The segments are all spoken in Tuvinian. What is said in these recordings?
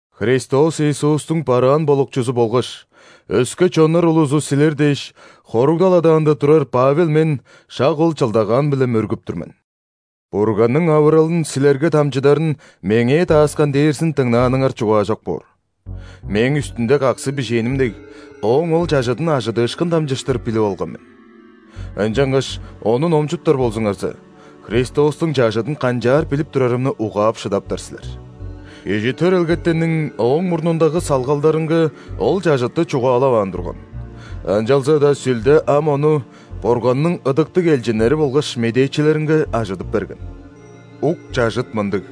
Христос Иисустуң бараан болукчузу болгаш, өске чоннар улузу силер дээш, хоругдал адаанда турар Павел мен шак ол чылдагаан-биле мөргүп тур мен. Бурганның авыралын силерге дамчыдарын меңээ дааскан дээрзин дыңнааныңар чугаажок боор. Мээң үстүнде каксы бижээним дег, Ооң ол чажыдын ·ажыдыышкын дамчыштыр билип алган мен. Ынчангаш ону номчуптар болзуңарза, Христостуң чажыдын канчаар билип турарымны угаап шыдаптар силер. Кижи төрелгетенниң ооң мурнундагы салгалдарынга ол чажытты чугаалаваан турган, ынчалза-даа Сүлде ам ону Бурганның ыдыктыг элчиннери болгаш медээчилеринге ажыдып берген. Ук чажыт мындыг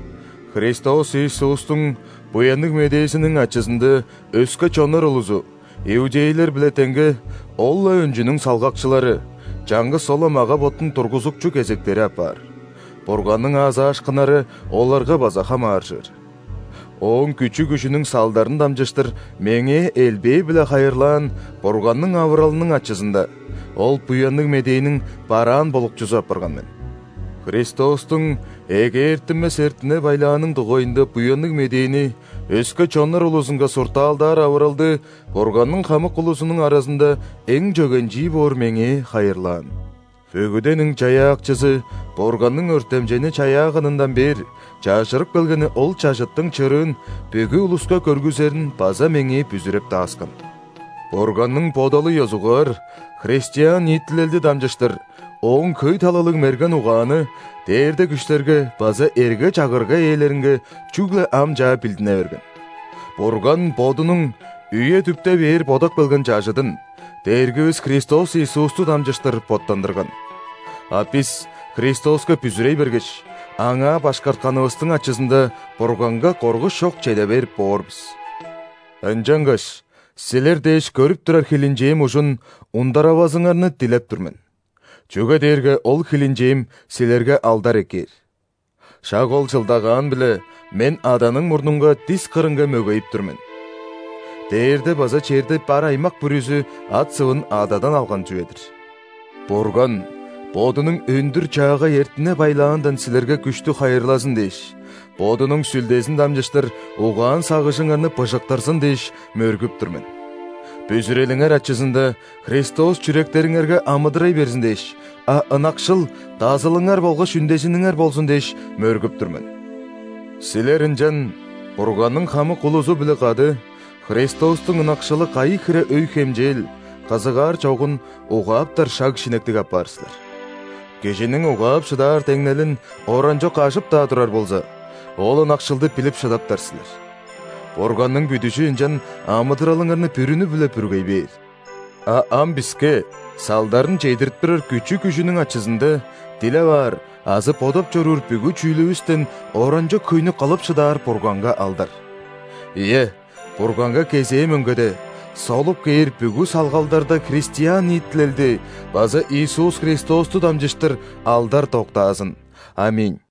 – Христос Иисустуң Буянныг Медээзиниң ачызында өске чоннар улузу, иудейлер-биле деңге, ол-ла өнчүнүң салгакчылары, чаңгыс ол-ла мага-боттуң тургузукчу кезектери апаар, Бурганның аазаашкыннары оларга база хамааржыр. Ооң күчү-күжүнүң салдарын дамчыштыр меңээ элбээ-биле хайырлаан Бурганның авыралының ачызында, ол Буянныг Медээниң бараан болукчузу апарган мен. Христостуң эгээртинмес эртине-байлааның дугайында Буянныг Медээни өске чоннар улузунга суртаалдаар авыралды Бурганның хамык улузунуң аразында эң чөгенчии боор меңээ хайырлаан. Бүгүдениң Чаяакчызы Бурганның өртемчейни чаяаганындан бээр чажырып келгени ол чажыттың чырыын бүгү улуска көргүзерин база меңээ бүзүреп дааскан. Бурганның бодалы ёзугаар христиан ниитилелди дамчыштыр Ооң хөй талалыг мерген угааны дээрде күштерге база эрге-чагырга ээлеринге чүгле ам чаа билдине берген. Бурган Бодунуң үе-дүпте бээр бодап келген чажыдын Дээргивис Христос Иисусту дамчыштыр боттандырган, а бис Христоска бүзүрей бергеш, Аңаа башкартканывыстың ачызында, Бурганга коргуш чок чеде берип боор бис. Ынчангаш силер дээш көрүп турар хилинчээм ужун ундаравазыңарны дилеп тур мен, чүге дээрге ол хилинчээм силерге алдар эккээр. Шак Ол чылдагаан-биле мен Аданың мурнунга дис кырынга мөгейип тур мен. (Дээрде база черде бар аймак бүрүзү ат-сывын Ададан алган чүве-дир). Бурган Бодунуң өндүр-чаагай эртине-байлаандан силерге күштү хайырлазын дээш, Бодунуң Сүлдезин дамчыштыр угаан-сагыжыңарны быжыктырзын дээш, мөргүп тур мен. Бүзүрелиңер ачызында, Христос чүректериңерге амыдырай берзин дээш, а ынакшыл – дазылыңар болгаш үндезиниңер болзун дээш, мөргүп тур мен. Силер ынчан Бурганның хамык улузу-биле кады Христостуң ынакшылы кайы хире өй-хемчээл, кызыгаар чогун угааптар шаг-шинектиг апаар силер. Кижиниң угаап шыдаар деңнелин оранчок ажып-даа турар болза, ол ынакшылды билип шыдаптар силер. Бурганның бүдүжү ынчан амыдыралыңарны бүрүнү-биле бүргей бээр. А ам биске салдарын чедирип турар күчү-күжүнүң ачызында, дилеп аар азы бодап чоруур бүгү чүүлүвүстен оранчок хөйнү кылып шыдаар Бурганга алдар! Ийе, Бурганга кезээ мөңгеде, солуп кээр бүгү салгалдарда христиан ниитилелди база Иисус Христосту дамчыштыр алдар доктаазын! ·Аминь.